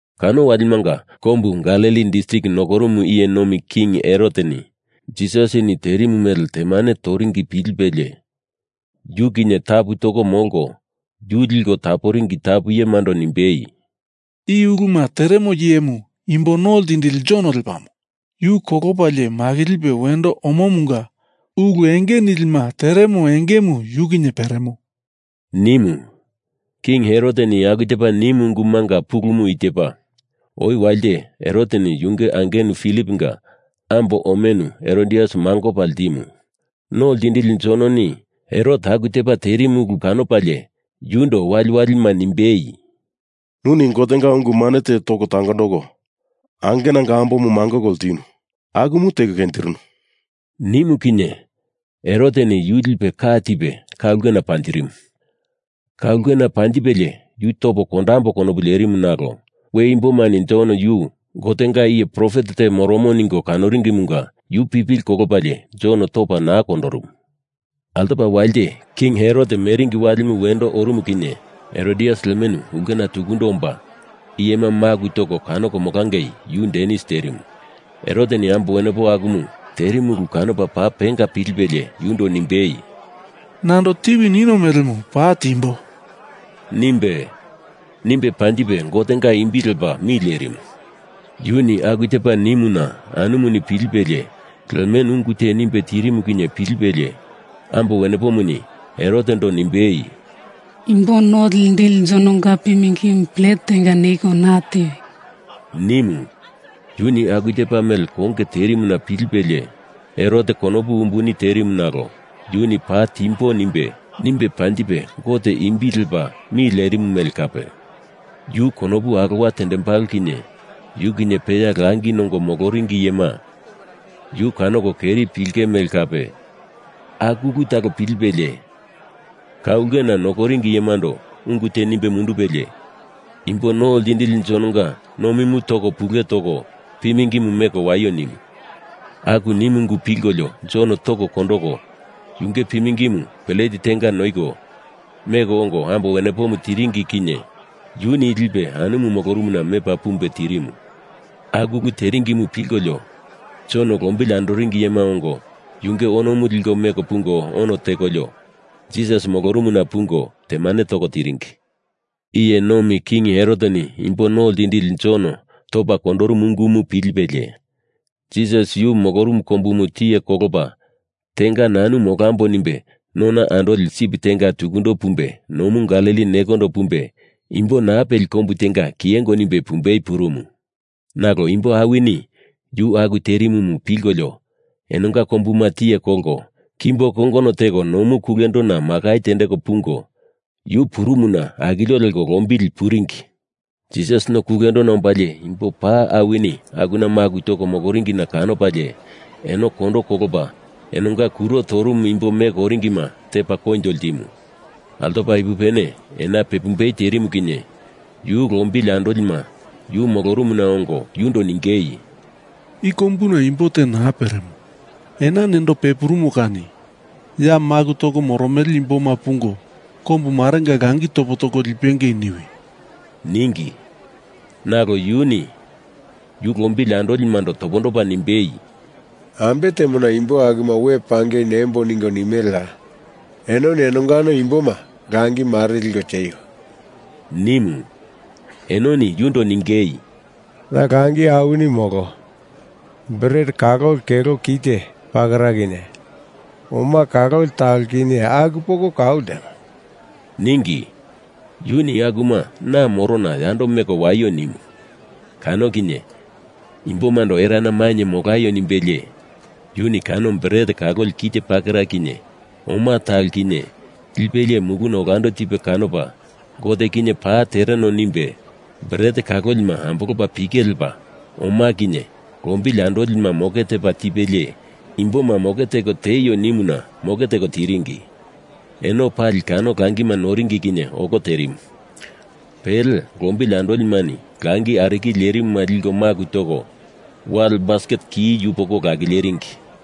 Kano walimanga kombu Galili distrik nokorumu iye nomi king Heroteni Jisasini terimu mele temane toringi pilipelie yu kinye tapu toko molko yu liko taporingi tapu iyemando nimbei, “I uluma teremo iyemu Imbo No Ltindili Jon lepamo! Yu kolopalie makilipe wendo omomunga ulu enge nilima teremo engemu yu kinye peremo,” nimu. King Heroteni aku tepa nimu ungumunga pulumu i tepa: Oi walite Heroteni yunge angenu Filiponga ambo omenu Herodias mangopa ltimu. No Ltindili Jononi Herot aku tepa terimu ulu kanopalie yundo waliwalima nimbei, “Nuni Gotenga ungu mane te toko tangondoko angenanga ambomu mangoko ltinu. Akumu teko kenjirinu,” nimu kinye Heroteni yu lipe ka tipe ka ulkena panjirimu. Ka ulkena panjipelie yu topo kondambo konopu lerimu nalo we imbomani Jon yu Gotenga iye profet te moromo ningo kanoringimunga yu pipili kolopalie Jon topa naa kondorumu. Altopa walite king Herot meringi walimu wendo orumu kinye Herodias lemenu ulkena tukundo omba, iyema maku toko kanoko molangei yu danis terimu. Heroteni ambo wenepomu aku terimu ulu kanopa paa penga pilipelie yundo nimbei, “Nando tiwi ninio melemu paa timbo,” nimbe, nimbe panjipe Gotenga imbi lepa mi lerimu. Yuni aku tepa nimuna anumuni pilipelie lemenu ungu te nimbe tirimu kinye pilipelie ambo wenepomuni Herotendo nimbei, “Imbo No Ltindili Jononga pimingimu plet tenga noiko na tiwi,” nimu. Yuni aku tepa mele konge terimuna pilipelie Herot konopu umbuni terimu nalo yuni paa timbo nimbe, nimbe panjipe Gotenga imbi lepa mi lerimu mele kape, yu konopu alowa tendembalo kinye yu kinye peya langi nongo moloringi iyema yu kanoko keri pilinge mele kape, aku ulu talo pilipelie, ka ulkena nokoringi iyemando ungu te nimbe mundupelie Imbo No Ltindili Jononga nomimu toko pule toko pimingimu meko waio nimu. Aku nimu ungu pilkolio Jon toko kondoko, yunge pimingimu pelete tenga noiko, meko ongo ambo wenepomu tiringi kinye yuni lipe anumu molorumuna mepa pumbe tirimu. Aku ulu teringimu pilkolio Jon lombili andoringi iyema ongo yunge onomu liko meko pungo ono tekolio Jisas molorumuna pungo temane toko tiringi. Iye nomi king Heroteni Imbo No Ltindili Jon topa kondorumu ungumu pilipelie, Jisas yu molorumu kombumu tiye kolopa tenga nanu molambo nimbe nona andoli sip tenga tukundo pumbe nomu Galili nekondo pumbe imbo naa peli kombu tenga kiyengo nimbe pumbei purumu. Nalo imbo awini Yu aku terimumu pilkolio enonga kombuma tiye kolko kimbo kongono teko nomu kulendona makai tendeko pungo yu purumuna akilio leko lombili puringi. Jisas no kulendona ombalie imbo paa awini akuna maku toko moloringina kanopalie eno kondo kolopa enonga kuro torumu imbo meko oringima tepa koinjo ltimu. Altopa ipupene ena pepumbei terimu kinye Yu lombili andolima yu molorumuna ongo yundo ningei, “I kombuna imbo te naa peremo. Ena nendo pepurumo kani ya maku toko moromele imboma pungo kombu marenga langi topo toko lipengei niwi,” ningi. Nalo yuni yu lombili andolimando topondopa nimbei, “Ambe temona imbo akuma we pangei nembo ningo nimeleya? Enoni enongano imboma langi mare liko tieio,” nimu. Enoni yundo ningei, “Ya langi awini molo. Bret kaloli kelo kite pakera kinye oma kaloli talo kinye aku poko kau ltemo,” ningi. Yuni akuma na morona yando meko waio nimu. Kano kinye imbomando erana mainye molaio nimbelie yuni kano bret kaloli kite pakera kinye oma talo kinye lipelie muluna olando tipe kanopa Gote kinye paa tereno nimbe bret kalolima ambolopa pike lepa oma kinye lombili andolima moke tepa tipelie imboma moke teko tieio nimuna moke teko tiringi. Eno pali kano langima noringi kinye olo terimu. Pele lombili andolimani langi arikili lerimuma liko maku toko wale basket ki yupoko lakileringi.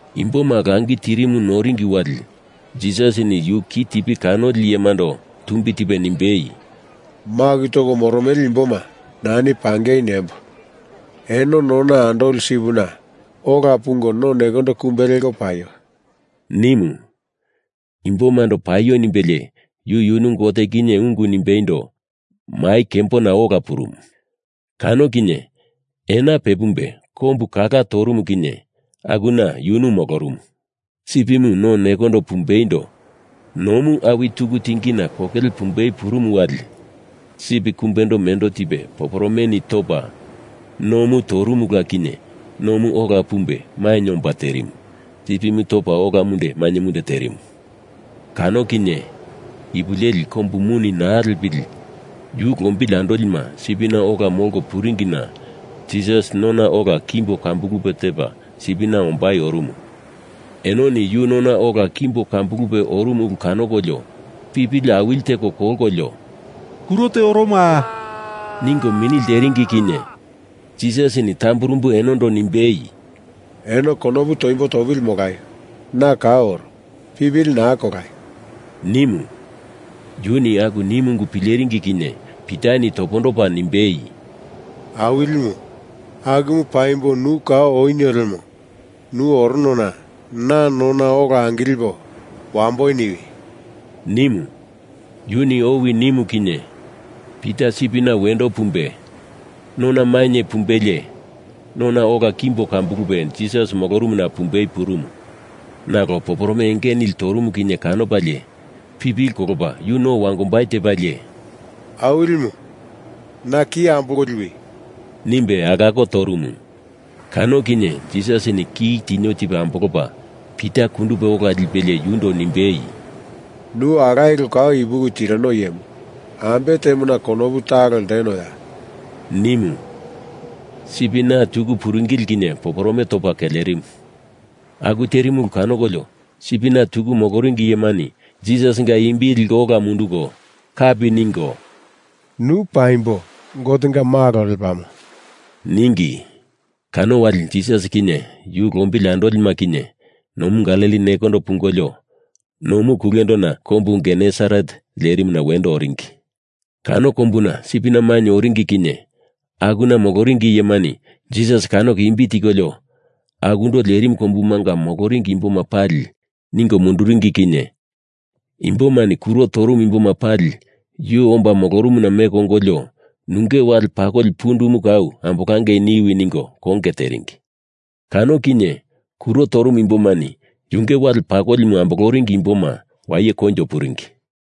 Imboma langi tirimu noringi wali Jisasini yu ki tipi kanoli iyemando tumbi tipe nimbei, “Maku toko moromele imboma nani pangei nembo. Eno nona andoli sipina ola pungo no nekondo kumbe leko paio,” nimu. Imbomando paio nimbelie yu yunu Gote kinye ungu nimbeindo mai kembona ola purumu. Kano kinye ena pepumbe kombu kala torumu kinye akuna yunu molorumu. Sipimu no nekondo pumbeindo nomu awi tuku tingina kokele pumbei purumu wali sip kumbendo mendo tipe poporomeni topa, nomu torumula kinye nomu ola pumbe mainye omba terimu, sipimu topa ola munde mainye munde terimu. Kano kinye ipu leli kombu muni naa lepili yu lombili andolima sipina ola molko puringina Jisas nona ola kimbo kambulupe tepa sipina ombai orumu. Enoni yu nona ola kimbo kambulupe orumu ulu kanokolio, pipili awili teko kolkolio “Kuro te oromoa!” ningo mini lteringi kinye Jisasini tamburumbu enondo nimbei, “Eno konopu toimbo topili molaio. Na kau oro. Pipili naa kolaio,” nimu. Yuni aku nimu ungu pileringi kinye Pitani topondopa nimbei, “Awilimu, akumu paimbo nu kau onio lemo nu oronona na nona ola angilipo wambo niwi,” nimu. Yuni owi nimu kinye Pita sipina wendo pumbe nona mainye pumbelie nona ola kimbo kambulupe Jisas molorumuna pumbei purumu. Nalo poporome enge nili torumu kinye kanopalie pipili kolopa yu no wangombai tepalie, “Awilimu, na ki ambolko liwi!” nimbe alako torumu. Kano kinye Jisasini ki tinio tipe ambolopa Pita kundupe ola lipelie yundo nimbei, “Nu alaye kolo kau ipuki tirino iyemu ambe temona konopu talo ltenoya?” nimu. Sipina tuku puringili kinye poporome topa kelerimu. Aku terimu ulu kanokolio sipina tuku moloringi iyemani Jisasinga imbi liko ola mundunduko kapi ningo “Nu paimbo Gotenga Malo lepamo,” ningi. Kano wali Jisas kinye Yu lombili andolima kinye nomu Galili nekondo pungolio nomu kulendona kombu Genesaret lerimuna wendo oringi. Kano kombuna sipina mainye oringi kinye akuna moloringi iyemani Jisas kanoko imbi tikolio akundo lerimu kombumanga moloringi imboma pali ningo munduringi kinye imbomani kuro torumu imboma pali yu omba molorumuna meko ongolio, nunge wale pakoli pundumu kau ambolangei niwi ningo konge teringi. Kano kinye kuro torumu imbomani yunge wale pakolimu amboloringi imboma waye koinjo puringi.